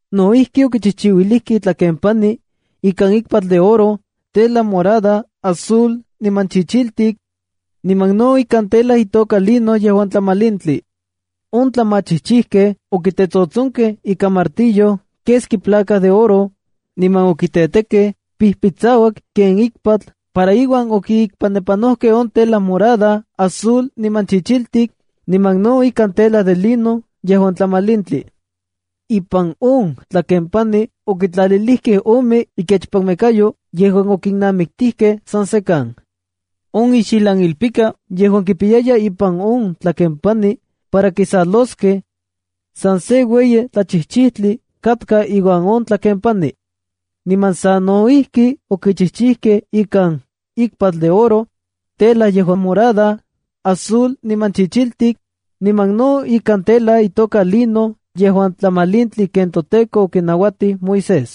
No ijki, okichijchijkej itlakempani ikan ikpatl de oro, tela morada, azul, niman chichiltik, niman no ikan tela itoka lino yejuan tlamalintli. On tlamachijchijkej okitetsotsonkej ika martillo keski placa de oro, niman okitetekej pijpitsauak ken ikpatl para iuan okiikpanepanojkej on tela morada, azul, niman chichiltik, niman no ikan tela de lino yejuan tlamalintli. Ipan on tlakempani okitlalilijkej ome ikechpanmekayo yejuan okinnamiktijkej san sekan. On ixijlanilpika yejuan kipiyaya ipan on tlakempani para kisaloskej, san se ueyi tlachijchijtli katka iuan on tlakempani. Niman sano ijki okichijchijkej ikan: ikpatl de oro, tela yejuan morada, azul, niman chichiltik, niman no ikan tela itoka lino yejuan tlamalintli ken toTEKO okinauatij Moisés.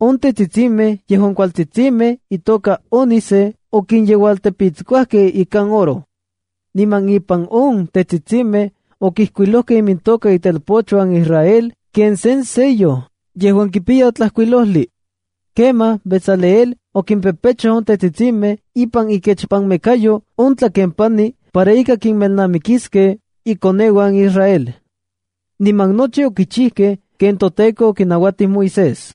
On tetsitsimej yejuan kualtsitsimej itoka ónice okinyeualtepitskuajkej ikan oro. Niman ipan on tetsitsimej okijkuilojkej imintoka itelpochuan Israel ken sen sello yejuan kipiya tlajkuilojli. Kemaj Bezaleel okimpepechoj on tetsitsimej ipan ikechpanmekayo on tlakempani para ika kinmelnamikiskej ikoneuan Israel. Niman nochi okichijkej ken toTEKO okinauatij Moisés.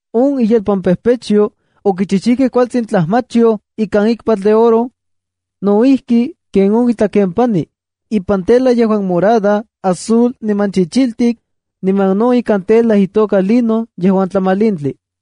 On iyelpanpejpechyo, okichijchijkej kualtsin tlajmachyoj ikan ikpatl de oro, no ijki ken on itlakempani, ipan tela yejuan morada, azul, niman chichiltik, niman no ikan tela itoka lino yejuan tlamalintli.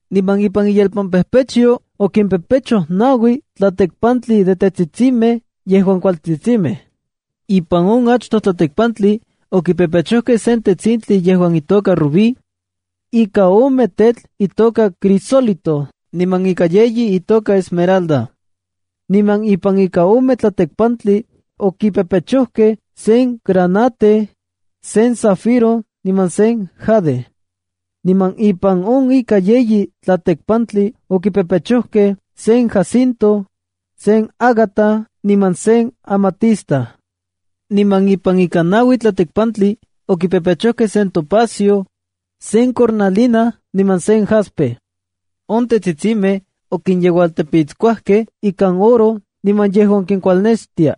Niman ipan iyelpampejpechyo okimpepechoj naui tlatekpantli de tetsitsimej yejuan kualtsitsimej. Ipan on achtoj tlatekpantli okipepechojkej sen tetsintli yejuan itoka rubí, ika ome tetl itoka crisólito niman ika yeyi itoka esmeralda. Niman ipan ika ome tlatekpantli, okipepechojkej sen granate, sen zafiro niman sen jade. Niman ipan on ika yeyi tlatekpantli okipepechojkej sen jacinto, sen ágata niman sen amatista. Niman ipan ika naui tlatekpantli okipepechojkej sen topacio, sen cornalina niman sen jaspe. On tetsitsimej okinyeualtepitskuajkej ikan oro niman yejuan kikualnextia.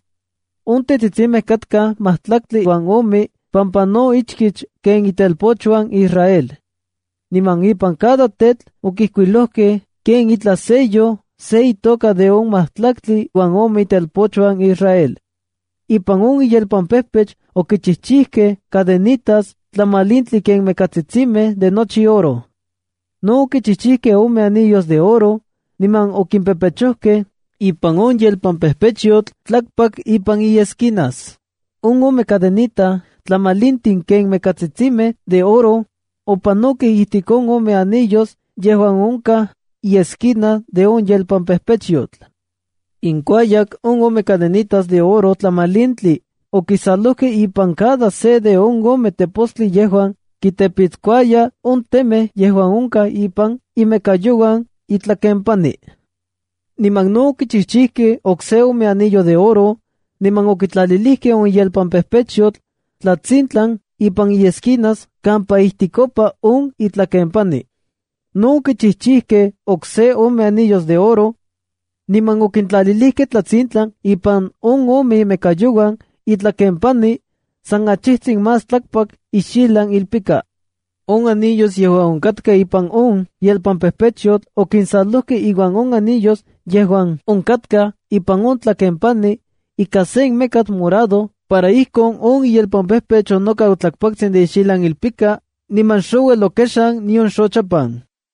On tetsitsimej katkaj majtlaktli uan ome pampa no ichkich ken itelpochuan Israel. Niman ipan cada tetl okijkuilokej ken itlaj sello se itoka de on majtlaktli uan ome itelpochuan Israel. Ipan on iyelpampejpech okichijchijkej cadenitas tlamalintli ken mekatsitsimej de nochi oro. No okichijchikej ome anillos de oro, niman okimpepechojkej ipan on yelpampejpechyotl tlakpak ipan iesquinas. On ome cadenita tlamalintli ken mekatsitsimej de oro opanokej ijtik on ome anillos yejuan onkaj iesquinas de on yelpampejpechyotl. Inkuayak on ome cadenitas de oro tlamalintli okisalojkej ipan cada se de on ome tepostli yejuan kitepiskuaya on temej yejuan onkaj ipan imekayouan itlakempani. Niman no okichijchijkej okse ome anillo de oro niman okitlalilikej on yelpampejpechyotl tlatsintlan ipan iesquinas kampa ijtikopa on itlakempani. No okichijchijkej okse ome anillo de oro, niman okintlalijkej tlatsintlan ipan on ome imekayouan itlakempani san achijtsin más tlakpak ixijlan ilpika. On anillos yejuan onkatkaj ipan on yelpampejpechyotl okinsalojkej iuan on anillos yejuan onkatkaj ipan on tlakempani ika sen mekatl morado para ijkon on iyelpampejpech onokau tlakpaktsin de ixijlan ilpika, niman xouel okexan nion xochapan.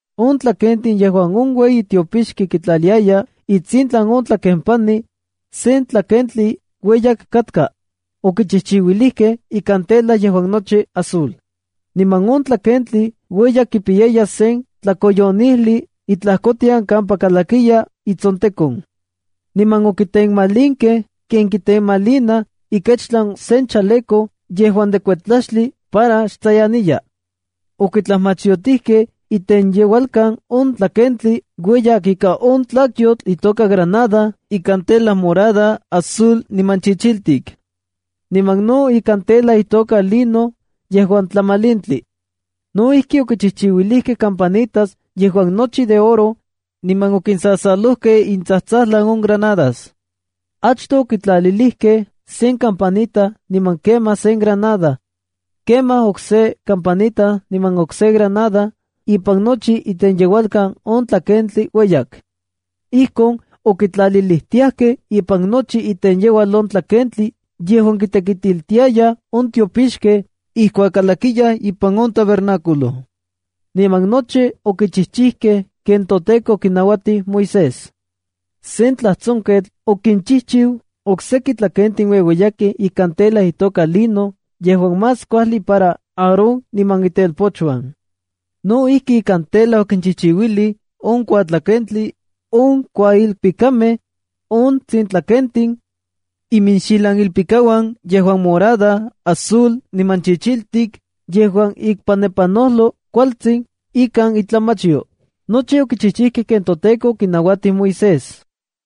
On tlakentli yejuan on ueyi tiopixki kitlaliaya itsintlan on itlakempani sen tlakentli ueyak katka, okichijchiuilijkej ikan tela yejuan nochi azul. Niman on tlakentli ueyak kipiyaya sen tlakoyonijli itlajkotian kampa kalakiya itsontekon. Niman okitenmalinkej ken kitenmalinaj ikechtlan sen chaleco yejuan de kuetlaxtli para xtsayaniya. Okitlajmachyotijkej itenyeualkan on tlakentli ueyak ika on tlakyotl itoka granada ikan tela morada, azul, niman chichiltik, niman no ikan tela itoka lino yejuan tlamalintli. No ijki, okichijchiuilijkej campanitas yejuan nochi de oro, niman okinsasalojkej itsajtsajlan on granadas. Achtoj okitlalilijkej sen campanita niman kemaj sen granada, kemaj okse kampanita niman okse granada ipan nochi itenyeualkan on tlakentli ueyak. Ijkon okitlalilijtiajkej ipan nochi itenyeualkan on tlakentli yejuan kitekitiltiayaj on tiopixkej ijkuak kalakiyaj ipan on tabernáculo. Niman nochi okichijchijkej ken toTEKO okinauatij Moisés. Sen tlajtsonketl okinchijchiu oksejki tlakentin ueueyakej ikan tela itoka lino yejuan más kuajli para Aarón niman itelpochuan. No ijki, ikan on tela okinchijchiuilij: on kuatlakenxomajtli, on kuailpikamej, on tsintlakentin, iminxijlanilpikauan yejuan azul, morado niman chichiltik yejuan ikpanepanojloj kualtsin ikan itlajmachyo. Nochi okichijchijkej ken toTEKO okinauatij Moisés.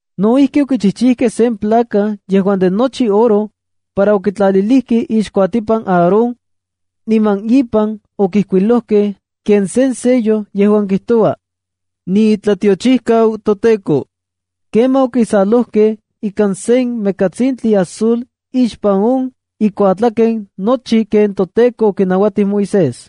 No ijki, okichijchijkej sen placa yejuan de nochi oro para okitlalij ixkuatipan Aarón, niman ipan okijkuilojkej ken sen sello yejuan kijtoua: “NIITLATIOCHIJKAU TOTEKO”. Kemaj okisalojkej ika sen mekatsintli azul ixpan on ikuatlaken nochi ken toTEKO okinauatij Moisés.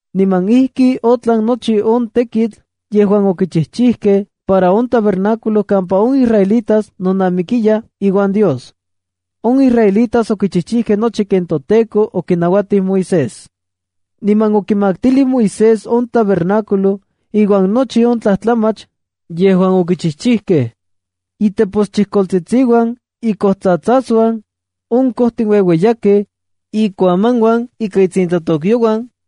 Niman ijki otlan nochi on tekitl yejuan okichijkej para on tabernáculo kampa on israelitas nonamikiyaj iuan Dios. On israelitas okichijkej nochi ken toTEKO okinauatij Moisés. Niman okimaktilijkej Moisés on tabernáculo iuan nochi on tlajtlamach yejuan okichijchijkej: iteposchijkoltsitsiuan, ikojtsatsasuan, on kojtin ueueyakej, ikuamanuan ika itsintlatokyouan,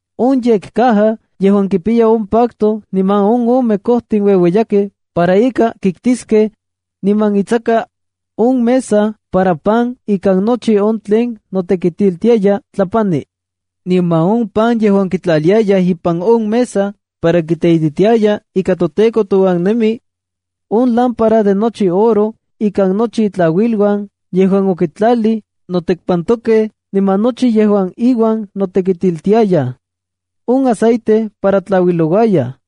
on yekcaja yejuan kipiya on pacto niman on ome kojtin ueueyakej para ika kiktiskej, niman itsaka, on mesa para pan ikan nochi on tlen notekitiltiaya tlapani, niman on pan yejuan kitlaliayaj ipan on mesa para kiteititiaya ika toTEKO touan nemi, on lámpara de nochi oro ikan nochi itlauiluan yejuan okitlalij notekpantokej niman nochi yejuan iuan notekitiltiaya, on aceite para tlauilouaya,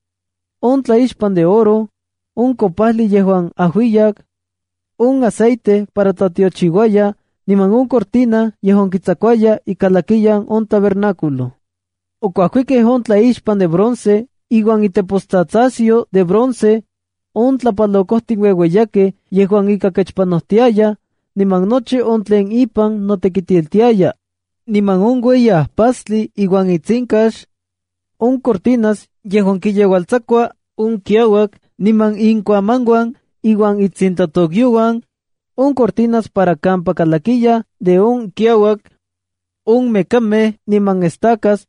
on tlaixpan de oro, on kopajli yejuan ajuiyak, on aceite para tlatiochiuayaj, niman on cortina yejuan kitsakuaya ikalakiyan on tabernáculo. Okuajkikej on tlaixpan de bronce iuan itepostsatsasyo de bronce, on tlapalokojtin ueueyakej yejuan ika kechpanojtiayaj, niman nochi on tlen ipan notekitiltiaya, niman on ueyi ajpastli iuan itsinkax, on cortinas yejuan kiyeualtsakua on kiauak niman ikuamanuan iuan itsintlatokyouan, on cortina para kampa kalakiyaj de on kiauak, on mekamej niman estacas,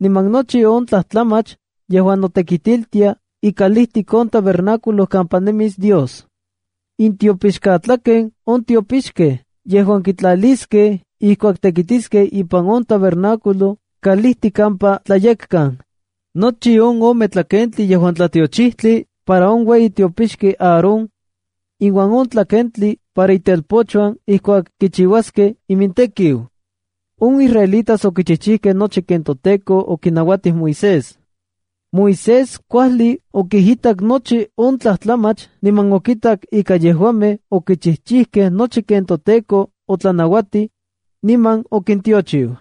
niman nochi on tlajtlamach yejuan notekitiltia ikalijtik on tabernáculo kampa nemis Dios, intiopixkatlaken on tiopixkej yejuan kitlaliskej ijkuak tekitiskej ipan on tabernáculo kalijtik kampa Tlayekkan, nochi on ome tlakentli yejuan tlatiochijtli para on ueyi tiopixki Aarón, iuan on tlakentli para itelpochuan ijkuak kichiuaskej imintekiu. On israelitas okichijkej nochi ken toTEKO okinauatij Moisés. Moisés kuajli okijitak nochi on tlajtlamach niman okitak ika yejuamej okichijchijkej nochi ken toTEKO otlanauatij, niman okintiochiu.